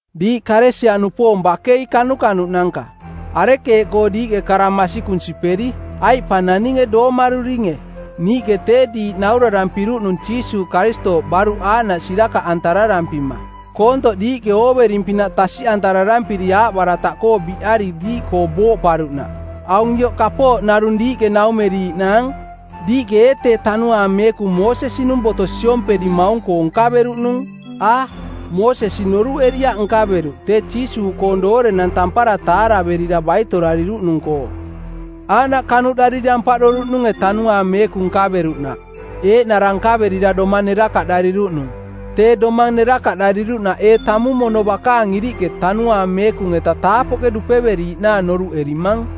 Diiꞌ Kalesia-nupoong bakei kanukanuꞌnanka! Arekeeꞌkoo diiꞌke kara masikung siperi, aiꞌ pa naninge doomaruringe? Niiꞌke tee diiꞌ naurarampiruꞌnung Jiisuuꞌ Karistooꞌ baruꞌ aaꞌnaꞌ sirakaꞌantararampima koontoꞌ diiꞌke oovering-pinaꞌ tasiꞌantarampiri aaꞌbarataꞌkoo biꞌari diiꞌkoo booꞌparuꞌnaꞌ. Aung ioꞌ kapooꞌ narung diiꞌke naumeriiꞌnaang: Diiꞌke ee tee Tanuaang Meekung Moosesi-nung Boto siomperimaung-koo nkaveruꞌnung? A, Moosesi noruꞌeriaꞌ nkaveruꞌ, tee Jiisuuꞌkoong doorenang tampara taaraverira baitorariruꞌnung-koo. Aaꞌnaꞌ kanuꞌdariri ampaꞌdoruꞌnunge Tanuaang Meekung nkaveruꞌnaꞌ, eeꞌnara nkaverira domang nerakaꞌdariruꞌnung? Tee domang nerakaꞌdariruꞌnaꞌ ee tamung mono bakaang iriꞌke Tanuaang Meekung-eta taapoꞌke dupeveriiꞌnaang noruꞌerimang?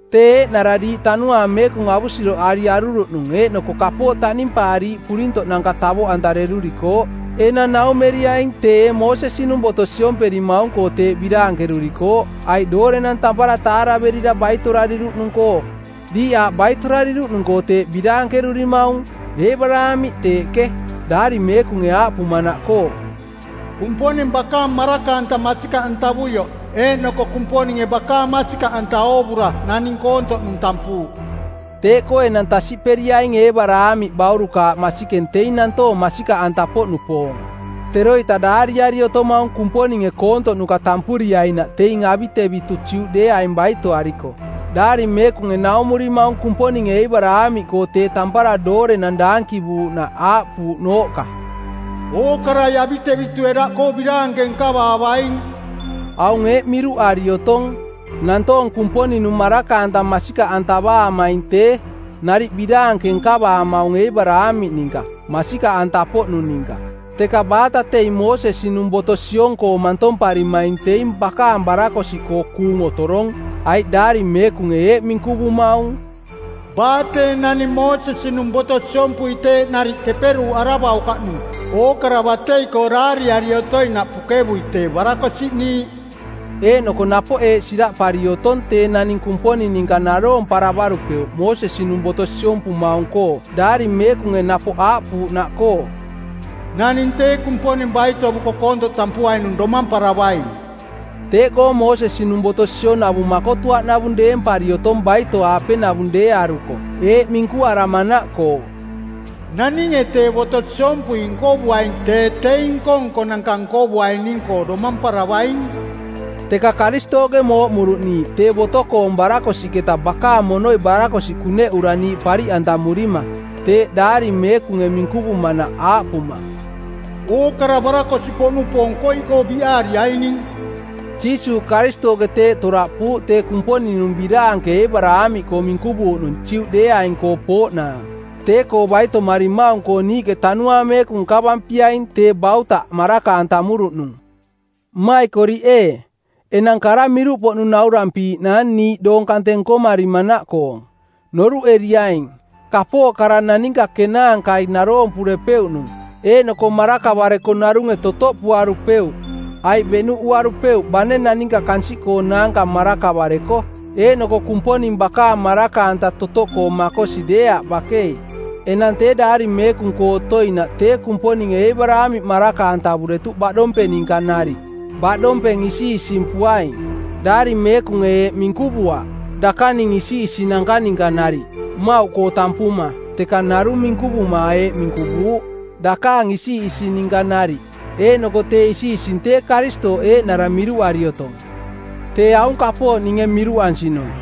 Tee eeꞌnara diiꞌ Tanuaang Meekung avusiroꞌari aruruꞌnung eeꞌnoko kapooꞌ taꞌnimpaariiꞌ purintoꞌnanka tavoꞌantarerurikooꞌ. Enang naumeriaing tee ee Moosesi-nung Boto siomperimaung-koo teeꞌ biraankerurikooꞌ aiꞌ doorenang tampara taaraverira baitorariruꞌnung-koo? Diiꞌ aaꞌ baitorariruꞌnung-koo teeꞌ biraankerurimaung. Eebaraamiꞌ teeꞌke, Daari Meekunge aaꞌpumanaꞌkoo: “Kumponing bakaang maraka-anta masikaꞌantavuioꞌ eeꞌnoko Kumponinge bakaang masikaꞌanta oovura naning koontoꞌnung tampuuꞌ.” Teeꞌkoo enang tasiꞌperiaing Eebaraamiꞌ baurukaaꞌ masikeng teing nantoong masikaꞌanta-poꞌnupoong. Teroita daariari otomaung Kumponinge koontoꞌnuka tampuriainaꞌ teing avitevitu Juꞌdeeaing baitoariko. Daari Meekunge naumurimaung Kumponinge Eebaraamiꞌkoo tee tampara doorenang daankivuuꞌnaꞌ aaꞌpuuꞌnooꞌka: “Ookarai avitevitue daꞌkoo biraanke nkavaavaing.” Aung eeꞌ miruꞌari otong: Nantoong Kumponing-nung maraka-anta masikaꞌantavaamaing tee, nariꞌ biraanke nkavaamaung Eebaraamiꞌ ninka, masikaꞌanta-poꞌnung ninka. Teka baata teing Moosesi-nung Boto siong-koo mantomparimaing teing bakaang barakosiꞌkoo kuung otorong, aiꞌ Daari Meekunge eeꞌ minkuvumaung: “Baa tee naning Moosesi-nung boto siompui teeꞌ nariꞌ keperuuꞌaravaukaꞌnung ookara batei-koo daariari otoinaꞌ pukevui tee barakosiꞌniiꞌ.” Eeꞌnoko napoꞌ eeꞌ siraꞌpari otong tee naning Kumponing ninka naroomparavarupeuꞌ Moosesi-nung boto siompumaung-koo Daari Meekunge napoꞌ aaꞌpuuꞌnaꞌkoo: “Naning tee Kumponing baitovuko koontoꞌ tampuainung domamparavaing.” Teeꞌkoo Moosesi-nung boto sionavung makotuaꞌnavung deempari otong baito-aapenavung deearuko eeꞌ minkuaramanaꞌkoo: “Naninge tee boto siompui nkovuaing tee teing nko-nkonanka nkovuaining-koo domamparavaing.” Teka Karistooꞌke mooꞌmuruꞌ niiꞌ tee boto-koong barakosiꞌketa bakaang monoi barakosiꞌ kuneꞌura niiꞌ pariꞌantamurima, teeꞌ Daari Meekunge minkuvumanaꞌ aaꞌpuma, “Ookara barakosiꞌpoꞌnupoong koiꞌkoo biꞌaariaining.” Jiisuuꞌ Karistooꞌke teeꞌ toraꞌpuuꞌ tee Kumponing-nung biraanke Eebaraamiꞌkoo minkuvuuꞌnung Juꞌdeeaing-koo pooꞌnaang, tee-koo baitomarimaung-koo niiꞌke Tanuaang Meekung nkavampiaing, tee bautaꞌ maraka-antamuruꞌnung. Mmaikoriꞌ ee, enang kara miruꞌpoꞌnung naurampiiꞌnaang niiꞌ doong kante nkomarimanaꞌkoong. Noruꞌeriaing, kapooꞌ kara naninka kenaankai naroompurepeuꞌnung, eeꞌnoko marakavareko narunge totoꞌpuarupeuꞌ aiꞌ beꞌnuꞌuarupeuꞌ bane naninka kansiꞌkoonaanka marakavareko, eeꞌnoko Kumponing bakaang maraka-anta totoꞌkoo makosi deeaꞌ bakei. Enang tee Daari Meekung-koo otoinaꞌ tee Kumponinge Eebaraamiꞌ maraka-antavuretuꞌ baꞌdompeng ninka nariꞌ, baꞌdompeng isiꞌisimpuaing. Daari Meekunge eeꞌ minkuvuaꞌ, “dakaning isiꞌisinanka ninka nariꞌ,” mmauꞌkoo tampuma, teka narung minkuvuma eeꞌ minkuvuuꞌ, “dakaang isiꞌising ninka nariꞌ.” Eeꞌnoko tee isiꞌising tee Karistooꞌ eeꞌnara miruꞌari otong. Tee aung kapooꞌ ninge miruꞌansinung: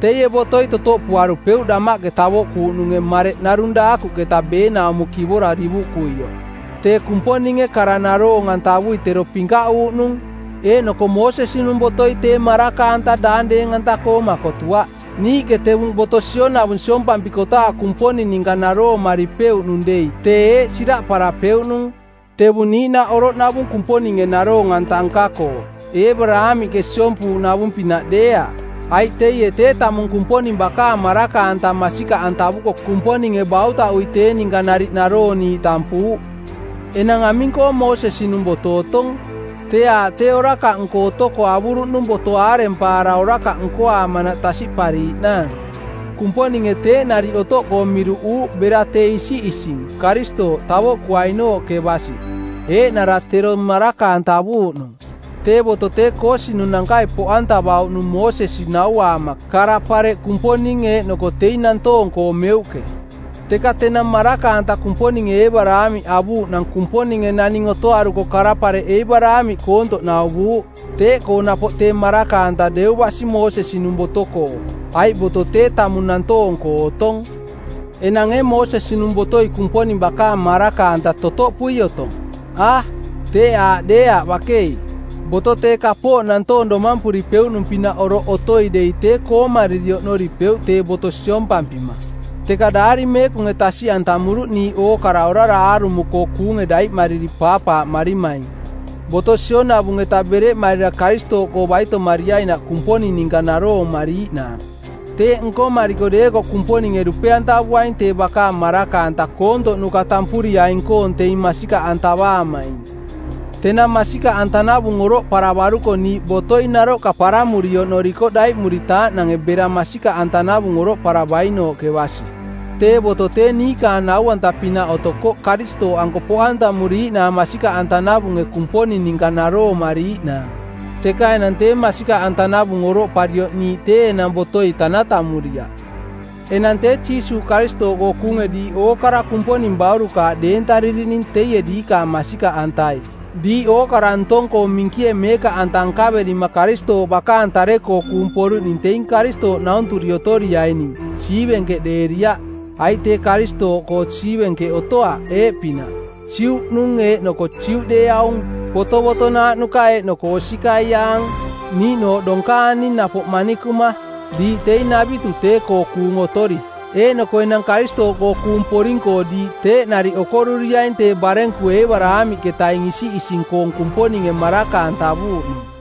Teie botoi totoꞌpuarupeuꞌ damaꞌke tavoꞌkuuꞌnunge mareꞌ narung daakuꞌketa beenaumo kivora divuꞌkuioꞌ. Tee Kumponinge kara naroong-antavui tero pinkaꞌuuꞌnung eeꞌnoko Moosesi-nung Botoi tee maraka-anta daang deeng-anta-koo makotuaꞌ. Niiꞌke tevung boto sionavung siompampikotaaꞌ Kumponing ninka naroomaripeuꞌnung dei tee eeꞌ siraꞌparapeuꞌnung: tevung niiꞌnaꞌ oroꞌnavung Kumponinge naroong-anta nka-koo, Eebaraamiꞌke siompuuꞌnavung-pinaꞌ deeaꞌ, aiꞌ teie tee tamung Kumponing bakaang maraka-anta masikaꞌantavuko Kumponinge bautaꞌui tee ninka nariꞌ narooniiꞌ tampuuꞌ. Enang aming-koo Moosesi-nung boto otong? Tee aaꞌ tee orakaꞌnko otoko avuruꞌnung boto aarempaara orakaꞌ nkoaamanaꞌ tasiꞌpariiꞌnaang. Kumponinge teeꞌ nariꞌ otoꞌkoo miruꞌuuꞌ bera tee isiꞌising, Karistooꞌ, tavoꞌkuainooꞌke basi, eeꞌnara tero maraka-antavuuꞌ nung. Tee boto tee koosinunankai poꞌantavauꞌnung Moosesi nauaama kara-pareꞌ Kumponing eeꞌnoko teing nantoong-koo meuꞌke. Teka tenang maraka-anta Kumponinge Eebaraamiꞌ avuuꞌnang Kumponinge naning otoaruko kara-pareꞌ Eebaraamiꞌ koontoꞌ nauvuuꞌ. Teeꞌkoo napoꞌ tee maraka-anta deu basi Moosesi-nung boto-koo, aiꞌ boto tee tamung nantoong-koo otong. Enang ee Moosesi-nung botoi Kumponing bakaang maraka-anta totoꞌpui otong? A, teeꞌ aaꞌ deeaꞌ bakei. Boto tee kapooꞌ nantoong domampuripeuꞌnung-pinaꞌ oroꞌ otoi dei tee koomariri oꞌnoripeuꞌ tee boto siompampima. Teka Daari Meekunge tasiꞌantamuruꞌ niiꞌ ookara orara aarumo-koo kuunge daiꞌmariri paapaaꞌmarimaing, boto sionavung-eta bereꞌmarira Karistooꞌkoo baitomariainaꞌ Kumponing ninka naroomariiꞌnaang. Teeꞌ nkomariko deekoꞌ Kumponinge dupe-antavuaing tee bakaang maraka-anta koontoꞌnuka tampuriaing-koong teing masikaꞌantavaamaing. Tenang masikaꞌantanavung oroꞌparavaruko niiꞌ botoi naroꞌka parammuri oꞌnorikoꞌ daiꞌmuritaaꞌnange bera masikaꞌantanavung oroꞌparavainooꞌke basi. Tee boto tee niikaang nau-anta-pinaꞌ otokoꞌ Karistooꞌanko poꞌantamuriiꞌnaang masikaꞌantanavunge Kumponing ninka naroomariiꞌnaang. Teka enang tee masikaꞌantanavung oroꞌparioꞌ niiꞌ tee enang botoi tanatamuriaꞌ. Enang tee Jiisuuꞌ Karistooꞌkoo kuunge diiꞌ ookara Kumponing baurukaaꞌ deentaririning teie diikaang masikaꞌantai. Diiꞌ ookara ntong-koo minkie meekaꞌanta nkaverima Karistooꞌ bakaang tare-koo kuung poruꞌning teing Karistooꞌnaunturi otoriaining, siivenkeꞌdeeriaꞌ. Aiꞌ tee Karistooꞌkoo siivenkeꞌ otoaꞌ eeꞌpinaꞌ: Juꞌnung eeꞌnoko Juꞌdeeaung, botovotonaaꞌ nuka eeꞌnoko osikaiaang, niiꞌnooꞌ donkaani napoꞌ manikuma. Diiꞌ teing navitu tee-koo kuung otori. Eeꞌnoko enang Karistooꞌkoo kuung poring-koo diiꞌ teeꞌ nariꞌ okoruriaing tee barenku Eebaraamiꞌketaing isiꞌising-koong Kumponinge maraka-antavuuꞌnung.